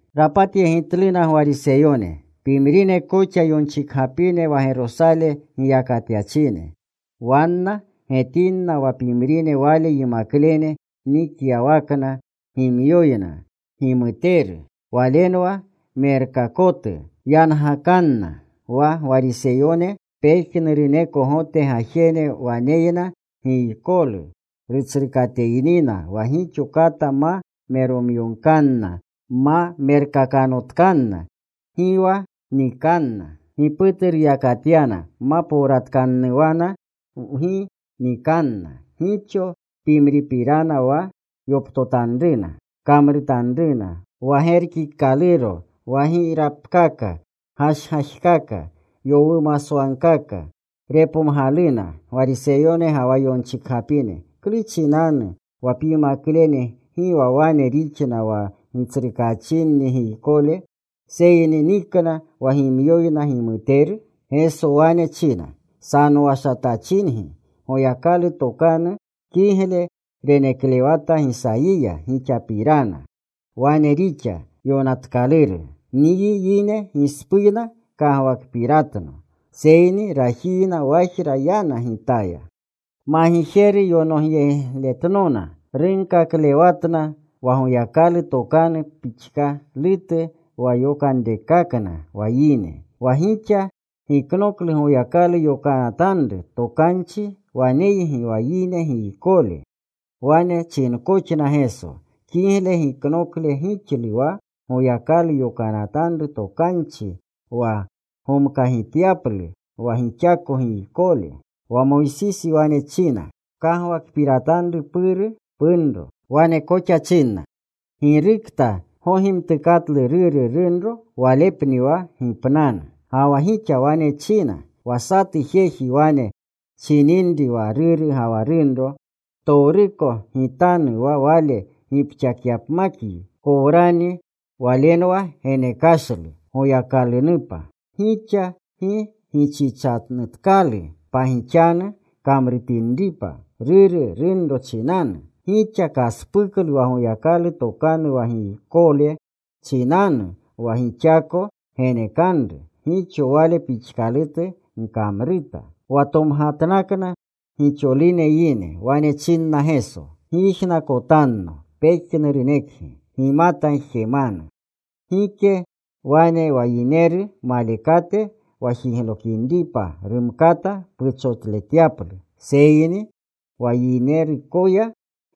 Rapatyegitluna Gwariseyone, pimrine koxa yonchikgapine wa Gerosale giyakatyachine. Wanna getinna wa pimrine Wale yimaklene nikyawakna gimyoyna gimuteru, walenwa merkakotu yangakanna. (Wa Gwariseyone, pejnuruneko Gote gajene waneyna giykolu rutsrukateynina wa gixo kata ma meromyogkanna ma merkakanotkanna gi wa nikanna. Giputu ruyakatyana ma powratkannuwana gi nikanna. Gixo pimripirana wa yoptotanruna kamrutanruna, wa gerkikaluro wa girapkaka, gashgajkaka, yowumaswagkaka.) Repomgaluna Gwariseyone ga wa yonchikgapine, “¿Klu chinanu wa pyimaklene gi wa wane rixna wa gitsrukaachinni giykole, seyni nikna wa gimyoyna gimuteru?” Geso wane china, “Sanowashatachingi. Goyakalu tokanu kigle reneklewata Gisayiya gixapirana. Wane rixa yonatkaluru: Nyi yine gispuyna kagwakpiratno seyni rajiyna wajra yanna Gitaya. Magijeru yonogleyegitnona. Runkaklewatna wa Goyakalu tokanu pixkalutu wa yokanrekakna wa yine. Wa gixa giknoklu Goyakalu yokanatanru tokanchi. Waneygi wa yine giykole.” Wane chinkoxna Geso, “Kigle giknokle gixlu wa Goyakalu yokanatanru tokanchi wa gomkagityaplu wa gixako giykole. Wa Moysisi wane china, ‘Pkagwakpiratanru puru punro.’ Wane koxa china, ‘Girukta gogimtukaklu ruru, runro walepni wa gipnanu.’ Ga wa gixa wane china, ‘Wa satu jeji wane chininri wa ruru ga wa runro, “Ptowruko gitanu wa wale gipxakyapmakyi, korwani” ’ (Walenwa genekashlu Goyakalunupa). Gixa gi gichichanutkalu pagixanu kamrutinripa ruru, runro chinanu. Gixa kaspuklu wa Goyakalu tokanu wa giykole chinanu wa gixako genekanru. Gixo wale pixkalutu gkamruta.” Wa tomgatnakna gixolune yine. Wane chinna Geso, “Gyijnakotanno pejnurunekgi. Gimata jemanu. Gike wane wa yineru malekate wa jiglokinripa rumkata puchotletyaplu, seyni wa yineruyako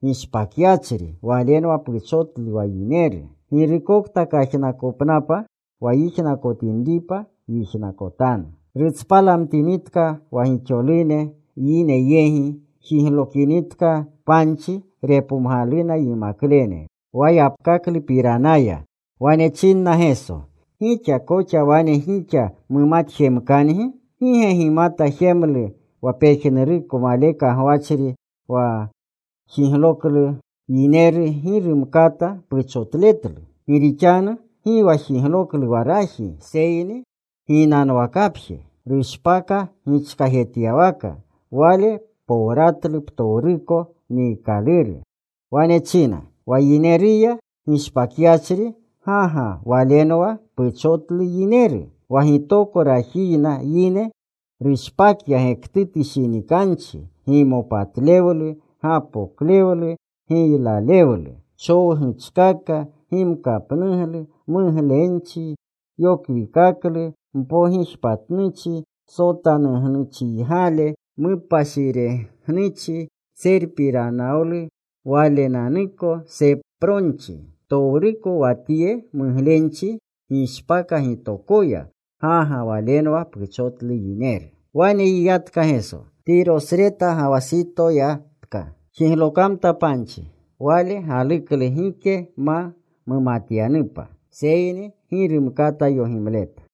gishpakyachri walenwa puchotlu wa yineru. Girukokta kajnakopnapa wa yijnakotinripa, yijnakotanu.” Rutspalamtinitka wa gixolune yine yegi, jiglokinitka panchi, repomgaluna yimaklene wa yapkaklupiranaya. Wane chinna Geso, “¿Gixa koxa wane gixa mumatjemkangi? ¿Gi ge gimata jemlu wa pejnuruko maleka gwachri wa jigloklu yineru gi rumkata puchotletlu? Gi rixanu gi wa jigloklu wa raji seyni ginanwakapje. Rushpaka gichkajetyawaka.” Wale powratlu ptowruko niikaluru. Wane china, “Wa yineruya gishpakyachri, ga ga walenwa puchotlu yineru. Wa gitoko rajiyna yine rushpakya gektutu shinikanchi, gimopatlewlu, gapoklewlu, giylalewlu, chowguchkaka, gimkapnuglu, muglenchi, yokwikaklu, mpogijpatnuchi, sotanugnuchiygale, mupashiregnuchi, tserpiranawlu walenanuko, sepronchi. Ptowruko wa tye muglenchi gishpaka gitokoya. Ga ga walenwa puchotlu yineru.” Wane yiyatka Geso. Tirosreta ga wa Sitoya yatka. Jiglokamta panchi. Wale galuklu gike ma mumatyanupa, seyni gi rumkata yogimleta.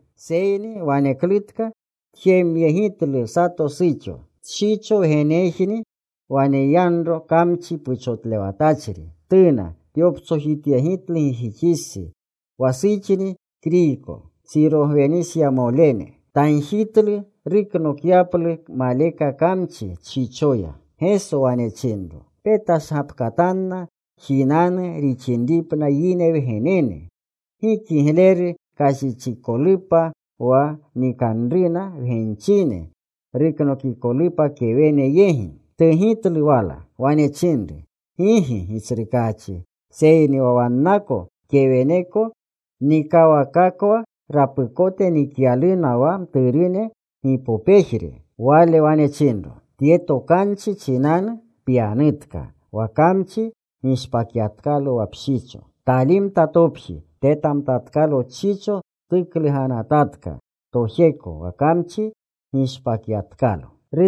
Seyni waneklutka tjemyegitlu sato suxo. Tshicho wgenejni waneyanro kamchi puchotlewatachri. Tuna. Tyoptsojityegitlu gijixistsi. Wa suxni Kriyko, Sirogwenisanemole. Tagjitlu ruknokyaplu maleka kamchi tshichoya. Geso wane chinro, “Petashgapkatanna jinanu rixinripna yine wgenene. Gi kigleru kashichikolupa wa nikanruna wgenchine, ruknokikolupa kewene yegi.” Tugitlu wala. Wane chinru, “Gigi, Gitsrukaachi, seyni wa wanna keweneko nikawakakwa rapukote nikyaluna wa mturune gipopejre.” Wale wane chinro, “Tye tokanchi chinanu pyanutka. Wa kamchi gishpakyatkalo wa pshicho.” Talimta topji. Tetamtatkalo tshicho tukluganatatka tojeko, wa kamchi gishpakyatkalo.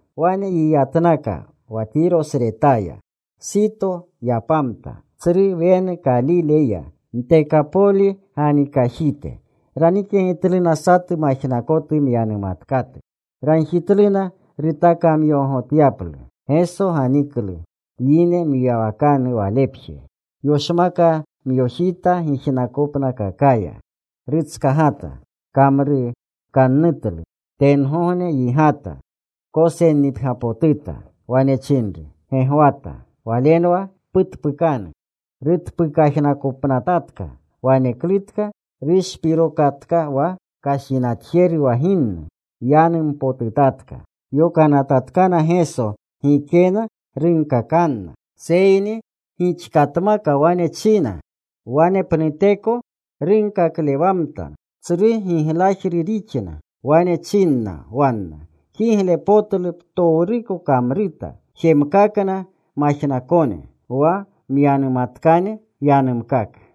Wane yiyatnaka wa Tirosretaya. Sito yapamta. Tsru wenu Kalile ya, Ntekapoli ganikajite. Ranikyegitluna satu majnakotu, myanumatkatu. Ragjitluna rutakamyogogotyaplu. Geso ganiklu yine mwiyawakanu Walepje. Yoshmakamyojita gijnakopnakakaya. Rutskagata. Kamrukannutlu. Tengogne yigata. Kosennipgyapotuta. Wane chinru, “Gegwata.” (Walenwa: Putpukanu.) Rutpukajnakopnatatka. Waneklutka rushpirokatka wa kashinatjeru wa ginnu. Yanumpotutatka. Yokanatatkana Geso gikena runkakanna, seyni gixkatmaka wane china wanepnuteko runkaklewamtna. Tsru giglajru rixna. Wane chinna wanna, “Kiglepotlu ptowruko kamruta. Jemkakna majnakone. Wa myanumatkane yanumkaka.”